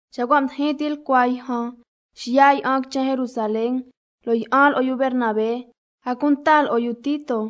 Xa cua' mdijin tilcua yjan xiya' yi'an quichen Jerusalén, lo' yi'an lo'o yu Bernabé, a cunta lo'o yu Tito.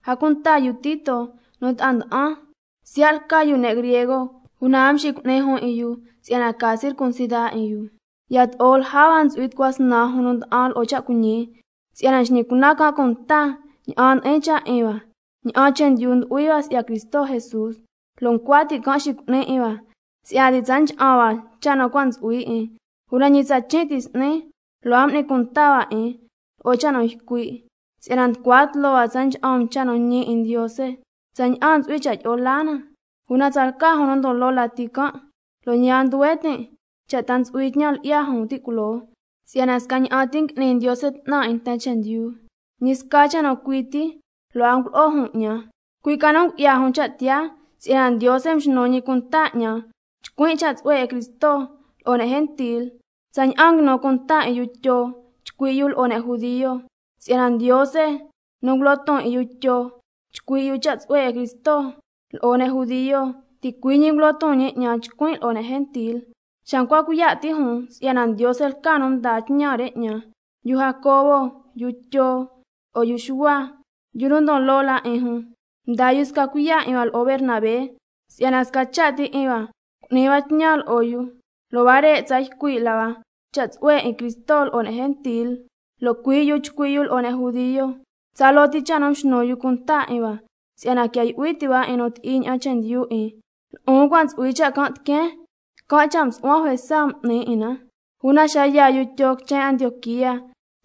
A cunta yu Tito nu ta'a nda'an, siya' lca yu sca ne' griego, una a mxicu'ni jun 'in yu si'yana ca circuncida 'in yu. Yato'o lja hua ntsu'hui cunan tucua snan jun nu nda'an lo'o cha' cuiñi, si'yana xñi can' cunta ña'an ndi'in cha' 'in hua tsaña'an mdo'o laa hua si'ya Cristo Jesús, lo' ncua ti' can' xicu'ni 'in hua si'yana ti' tsa ncha'an hua cha' nu cua' ntsu'hui 'in. Una ñi tsa chin' ti s'ni lo' a m'ni cunta hua 'in lo'o cha' nu ycui', si'yana nducua tloo hua tsa ncha'an um cha' nu ñi 'in Ndiose tsaña'an ntsu'hui cha' tyi'o la na. Una tsalca jun nu ndon loo lati can', (lo' ñi a ndyuhue tin' cha' ta ntsu'hui tñan lyi'ya jun ti' culoo, si'yana scaña'an ti ngui'ni Ndiose 'tnan 'in nten chendyu), ñi sca cha' nu cui ti lo' a ngulo'o jun 'ñan. Cui' ca nu ngu'ya jun cha' tiyaa si'yana Ndiose mxnu ñi cunta 'ñan chcuin' cha' tsu'hue 'in Cristo lo'o ne' gentil, tsaña'an nguinu cunta 'in yu Tyo chcui' yu lo'o ne' judio. (Si'yana Ndiose nu ngulo ton 'in yu Tyo chcui' yu cha' tsu'hue 'in Cristo lo'o ne' judio, ticui' ñi ngulo ton ñi 'ñan chcuin' lo'o ne' gentil). Xa ncua cuiya' ti' jun si'yana Ndiose lca nu mdaa tñan re 'ñan, yu Jacobo, yu Tyo lo'o yu Xuhua, yu nu ndon loo la 'in jun, mdaa yu sca cuiya' 'in hua lo'o Bernabé si'yana sca cha' ti 'in hua cu'ni hua tñan lo'o yu, lo' huare' tsa ycui' la hua cha' tsu'hue 'in Cristo lo'o ne' gentil lo' cui' yu chcui' yu lo'o ne' judio. Tsaloo ti cha' nu mxnu yu cunta 'in hua si'yana quia yu'hui ti' hua 'in nu ti'i ña'an chendyu 'in, lo'on cua' ntsu'hui cha' can' tiqueen, can' cha' msu'huan juesa m'nin 'in na. Una xa yaa yu Tyo quichen Antioquía,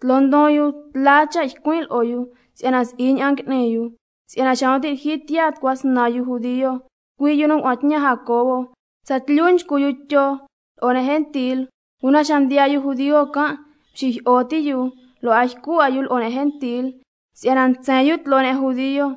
tloo ndon yu tla cha' ycuin' lo'o yu si'yana si'i ña'an ngui'ni yu. Si'yana xa nu ti' lyijyi tiyaa tucua snan yu judio, cui' yu nu ngua'an tñan Jacobo, yu Tyo tsatlyu nchcu yu lo'o ne' gentil, una xa mdiyaa yu judio can' mxijyi'o ti' yu lo' a ycu 'a yu lo'o ne' gentil si'yana ntsen yu tloo ne' judio.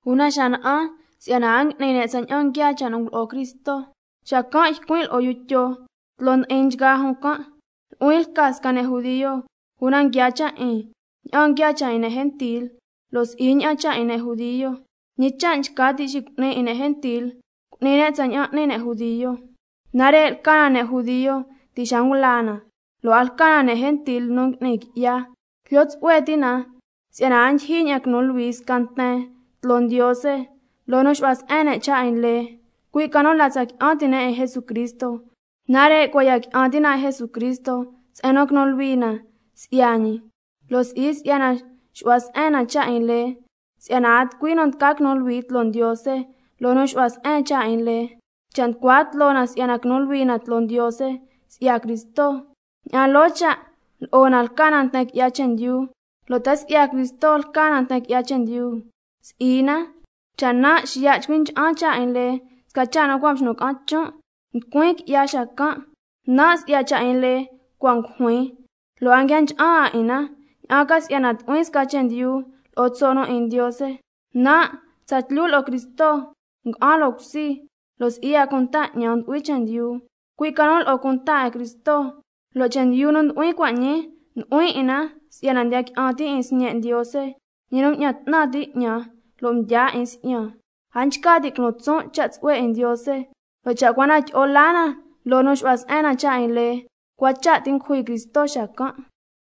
Una xa na'an si'yana a ngui'ni ne' tsaña'an nguiaa cha' nu ngulo'o Cristo, xacan' ycuin' lo'o yu Tyo tloo ndi'in nchgaa jun can': Nu'huin lca sca ne' judio, una cua' ñii ngui'ni tsaña'an n'ni ne' gentil, lo' si'i ña'an n'ni ne' judio. ¿Ñi cha' nchca ti' xicu'ni 'in ne' gentil cu'ni ne' tsaña'an n'ni ne' judio? Nare' lca na ne' judio ti' xa ngula na, lo' a lca na ne' gentil nu ngui'ni qui'ya, jlyo tsu'hue ti' na si'yana a ndyijyin ña'an quinu luhui sca nten tloo Ndiose loo nu xu'hua se'en ne' cha' 'in lee, cui' ca nu la tsa qui'an ti' ne' 'in Jesucristo. Nare' cua' ya qui'an ti' na 'in Jesucristo se'en nu quinu luhui na si'ya ñi, lo' si'i si'yana xu'hua se'en na cha' 'in lee, si'yana —a tucui nu tca quinu luhui tloo Ndiose— loo nu xu'hua se'en cha' 'in lee. Cha' nducua tloo na si'yana quinu luhui na tloo Ndiose si'ya Cristo, ña'an loo cha' lo'o na lca na nten qui'ya chendyu. ¿Lo' ta si'ya Cristo lca na nten qui'ya chendyu? Si'i na. Cha' nan' xiya' chcui cha'an cha' 'in lee, sca cha' nu cua' mxnun ca'an chon', nducuin qui'ya xacan'. Nan' si'ya cha' 'in lee cua' ngujuin lo'o cunta 'in na, ña'an ca si'yana tu'huin sca chendyu lo'o tso' nu 'in Ndiose. Nan' tsatlyu lo'o Cristo nga'an loo cusi, lo' si'i 'a cunta 'ñan ndu'huin chendyu, cui' ca nu lo'o cunta 'in Cristo, lo' chendyu nu ndu'huin cua' ñii, ndu'huin 'in na si'yana ndiya qui'an tin' 'in Sñe' Ndiose, ñi nu mña'an 'tnan ti' 'ñan lo' mdyaa 'in si'yan. A nchca tin' culon tson' cha' tsu'hue 'in Ndiose, lo' cha' cua na tyi'o laa na loo nu xu'hua se'en na cha' 'in lee, cua cha' ti ngujui Cristo xacan'.